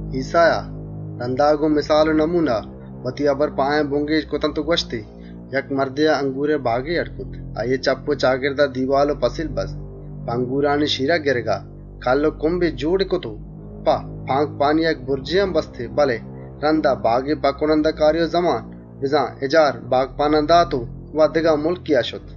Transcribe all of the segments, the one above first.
ایسّایا، رَندا گۆن مِسال و دَروَر وتی هبر گۆن آیان بُنگێج کرت و گوَشتی: «مردێا انگوری باگے اڈّ کرت. آییئے چپّ و چاگردا پَلّ و پَسیلی بست، په انگورانی شیرگئے گِرگا کَلّ و کُمبے جۆڑی کرت و په نگهپانیا یک بُرجے هم بستی. رَندا باگی په کُنندهکاری و زمان لهتێن باگپانئے دستا دات و وت سپرێا شت.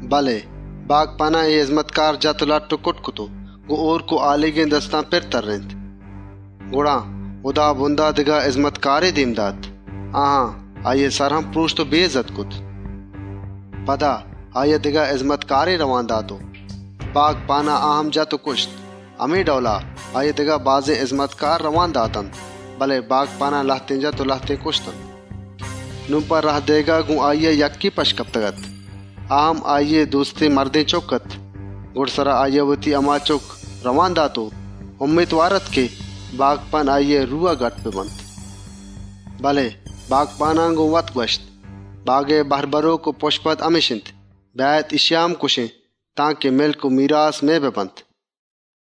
بله باگپانان اے هِزمتکار لَٹّ و کُٹّ کرت و گۆن هۆرک و هالیگێن دستان پِر تَرّێنت. گڑا، هُدابُندا دگه هِزمتکارے دێم دات. آیان، آییئے سر هم پرۆشت و بےاِزّت کرت. پدا دگه هِزمتکارے رئوانی دات و باگپانان آ هم جت و کُشت. همے ڈئولا، آییا دگه بازێن هِزمتکارے راه دات، بله باگپانان لهتێن جت و لهتێن کُشت. نون په راه دئیگا گۆن آییا یکّے پَشت کپتگاَت، آ هم آییئے دۆستێن مردێنچُکّ اَت. گُڈسرا، وتی هما چُکّی رئوان دات، هئیالی کرت بلکێن آییئے روا بدارنت. بله باگپانان وتمانوتا گوَشت: ‹باگئے میراس بَرۆک همِش اِنت، بیاێت اِشیا هم کُشێن، تانکه مِلک و میراس مئے ببنت.›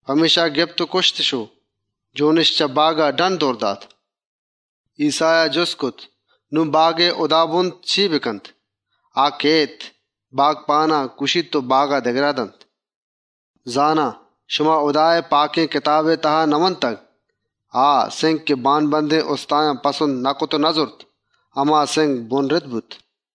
پمێشکا گپت و کُشتِش و جۆنِش چه باگا ڈَنّ، دئور دات.» ایسّایا جُست کرت: «نون شمئے گُمانا باگئے هُدابُند چے کنت؟ آ کئیت، باگپانانَ کُشیت و باگا دگه باگپانانی دستا دنت. زانا، شما پاکێن کتابا نئوانتگ: آ سِنگ که بانبَندێن اُستایان پسند نکرت و نزُرت هما سِنگ، بُنهِشت بوت.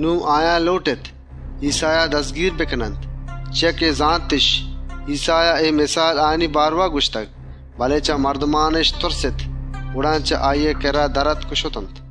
نون آیان لۆٹت ایسّایا دَزگیر بکننت، چیا که زانتِش ایسّایا اے مِسال همایانی بارئوا آورتگ، بله چه مردمانَ تُرستِش. گڑا چه آییئے کِرّا در آتک و شتنت.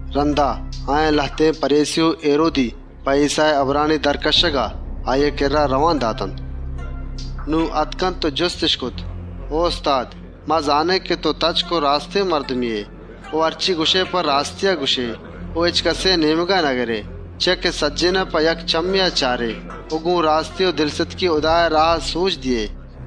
رَندا، آیان لهتێن پَریسی و هیرودی په ایسّائے هبرانی در کَشّگا، آییئے کِرّا رئوان دات. نون آتک و جُستِش کرت: او استاد! ما زانێن که تئو تچک و راستێن مردمے ائے و هرچے گوَشئے په راستیا گوَشئے و هچکَسێئے نێمگا نگرئے، چیا که سجّهێنان په یک چمّێا چارئے و گۆن راستی و دلستکی هُدائے راها سۆجَ دئیئے.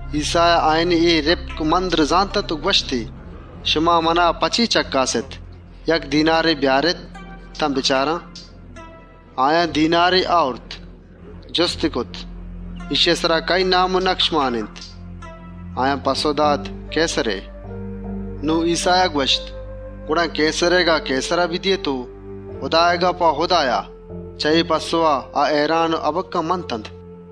ایسّایا آیانی اے دوتل و دوپۆستی زانت و گوَشتی: «چیا منا چَکّاسگا اێت؟ یک دینارے بیارێت تان بچاران.» آیان دینارے آورت. جُستی کرت: «اِشیئے سرا کئیی نام و نَکش پِر اِنت؟» آیان پَسّئو دات: «کئیسرئے.» نون ایسّایا گوَشت: «گڑا کئیسرئیگا کئیسرا بدئیێت و هُدائیگا هُدایا بدئیێت.» چه اے پَسّئوا، آ هئیران و هَبَکَّه منتنت.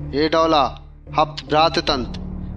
اے ڈئولا، هپت برات اتنت.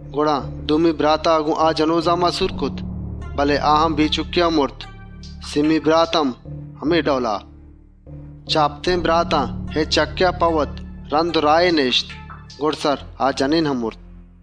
گڑا دومی براتا گۆن آ جنۆزاما سور کرت، بله آ هم بے چُکّا مرت. سئیمی برات هم، همے ڈئولا. چه هپتێن براتان هچکَسا په وت رَند و راهے نهاِشت. گُڈسرا، آ جنێن هم مرت.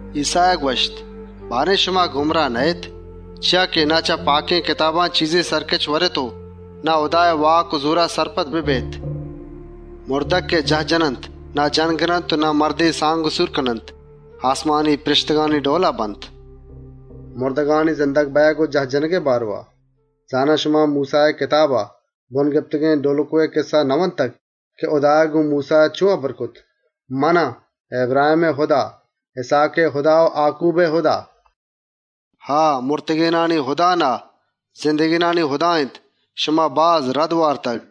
ایسّایا گوَشت: «شما گُمراه نهاێت؟ پرچا که نه چه پاکێن کتابان چیزے سَرکِچَ ورێت و نه هُدائے واک و زۆرا سرپدَ بێت. مُردگ که جاهَ جننت، نه سورَ کننت و نه سور دئیگَ بنت، آسمانی پرێشتگانی ڈئولا بنت. مُردگانی پدا زندگ بئیگ و جاه جنَگئے بارئوا، زانا شما موسّائے کتابا بُن گپتگێن ڈۆلُکئے کِسّه نئوانتگ، که هُدایا گۆن موسّایا چۆن هبر کرت؟ ‹من آن، اِبراهێمئے هُدا، اِسْهاکئے هُدا و آکوبئے هُدا.› بزان آ، مُردگانی هُدا نهاِنت، زندگێنانی هُدا اِنت. شما باز رَد وارتگ.»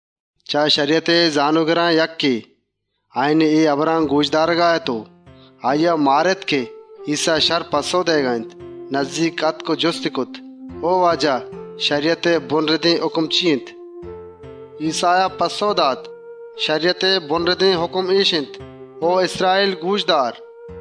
چه شَریَتئے زانۆگران یکّے، آیانی اے هبران گۆش دارگا اَت و آییا مارِت که ایسّا شَرّ پَسّئو دئیگا اِنت، نزّیک آتک و جُستی کرت: «شَریَتئے مسترێن هُکم کجام اِنت؟» ایسّایا پَسّئو دات: «شَریَتئے مسترێن هُکم اِش اِنت: ‹او اِسراییل! گۆش دار: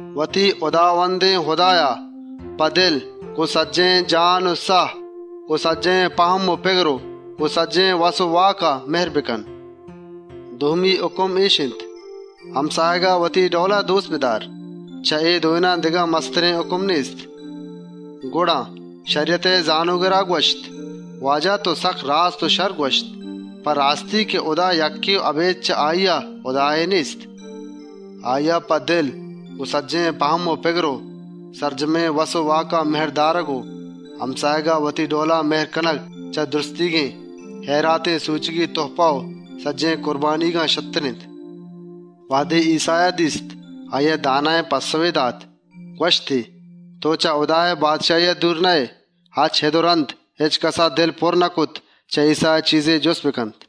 وتی هُداوندێن هُدایا، په دل، گۆن سجّهێن جان و ساه، گۆن سجّهێن پَهم و پِگر و گۆن سجّهێن وس و واکا دۆست بدار.› دومی هُکم اِش اِنت: ‹گۆن وتی همساهگا وتی جندئے پئیما مِهر بکن.› چه اے دوێنان، دگه مسترێن هُکم نێست.» گڑا، شَریَتئے زانۆگرا گوَشت: «او استاد! تئو سکّ راست و شَرّ گوَشت، په راستی که هُدا یکّے و اَبێد چه آییا، هُدایے نێست. آییا په دل، گۆن سجّهێن پَهم و پِگر و سرجمێن وس و واکا دۆست دارگ و همساهگا وتی جندئے پئیما مِهر کنگ چه سجّهێن هئیراتیێن سۆچگی تُهپه و سجّهێن کُربانیگان شرتر اِنت.» وهدے ایسّایا دیست آییا داناێن پَسّئوے دات، گوَشتی: «تئو چه هُدائے بادشاهیا دور نهائے.» چه اِد و رَند، هچکَسا دل نکرت چه ایسّایا چیزے جُست بکنت.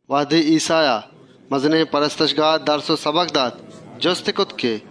وهدے ایسّایا، مزنێن پرستشگاها درس و سَبکَ دات، جُستی کرت که: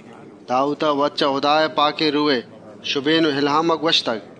داوودا وت چه هُدائے پاکێن روهئے شُبێن و اِلهاما گوَشتگ: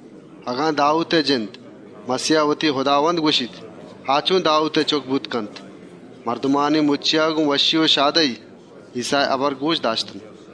«اگن داوودئے جند، مَسیها وتی هُداوندَ گوَشیت، گڑا آ چۆن داوودئے چُکّ بوتَ کنت؟» مردمانی مُچّیا گۆن وشّی و شادهی، ایسّائے هبر گۆشَ داشت.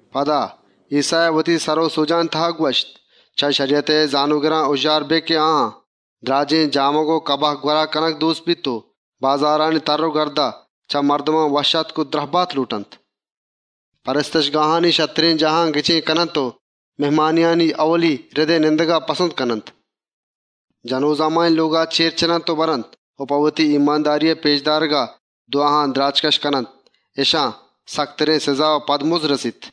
پدا، ایسّایا وتی سر و سۆجانی تها گوَشت: «چه شَریَتئے زانۆگران هُژّار بێت که آیان، دْراجێن جامگ و کباه گوَرا کنگ دۆستَ بیت و بازارانی تَرّ و گردا، چه مردمان وشّآتک و دْرَهباتَ لۆٹنت. کنیسهانی شرترێن جاهان گچێنَ کننت و مهمانیان، ائولی رِدئے نندگِش پسند اِنت. جنۆزامانی لۆگان گۆن مالواریا برنت و په پێش دارگا وتی دْوا و سَنایان دراجکَشَّ کننت. اِشان سکترێن سِزا و پدمُزَّ رسیت.»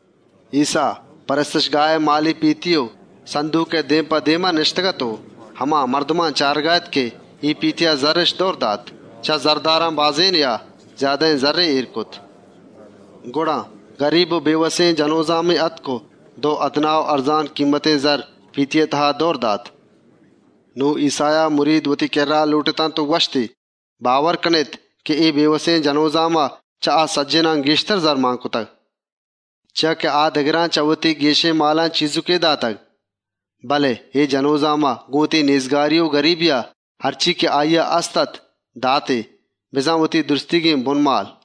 ایسّا، مزنێن پرستشگاهئے هئیراتانی پێتیئے دێم په دێما نِشتگاَت و هما مردمان چارگا اَت که اے پێتیا زَرِّش دئورَ دات. چه زَرداران بازێنێا، زیادهێن زَرّے اێر کرت. گڑا، گریب و بێوسێن جنۆزامے آتک و دو پئیسهی پێتیا مان کرت. نون ایسّایا مرید وتی کِرّا لۆٹتنت و گوَشتی: «شمارا راستێنَ گوَشان، اے بێوسێن جنۆزاما چه آ سجّهێنان گێشتر زرّ پێتیا مان کرت. چیا که آ دگران چه وتی گێشێن مالا چیزُکے دات، بله اے جنۆزاما، گۆن وتی نێزگاری و گریبیا، هرچے که آییا هستاَت داتی، بزان وتی سجّهێن بُنمال.»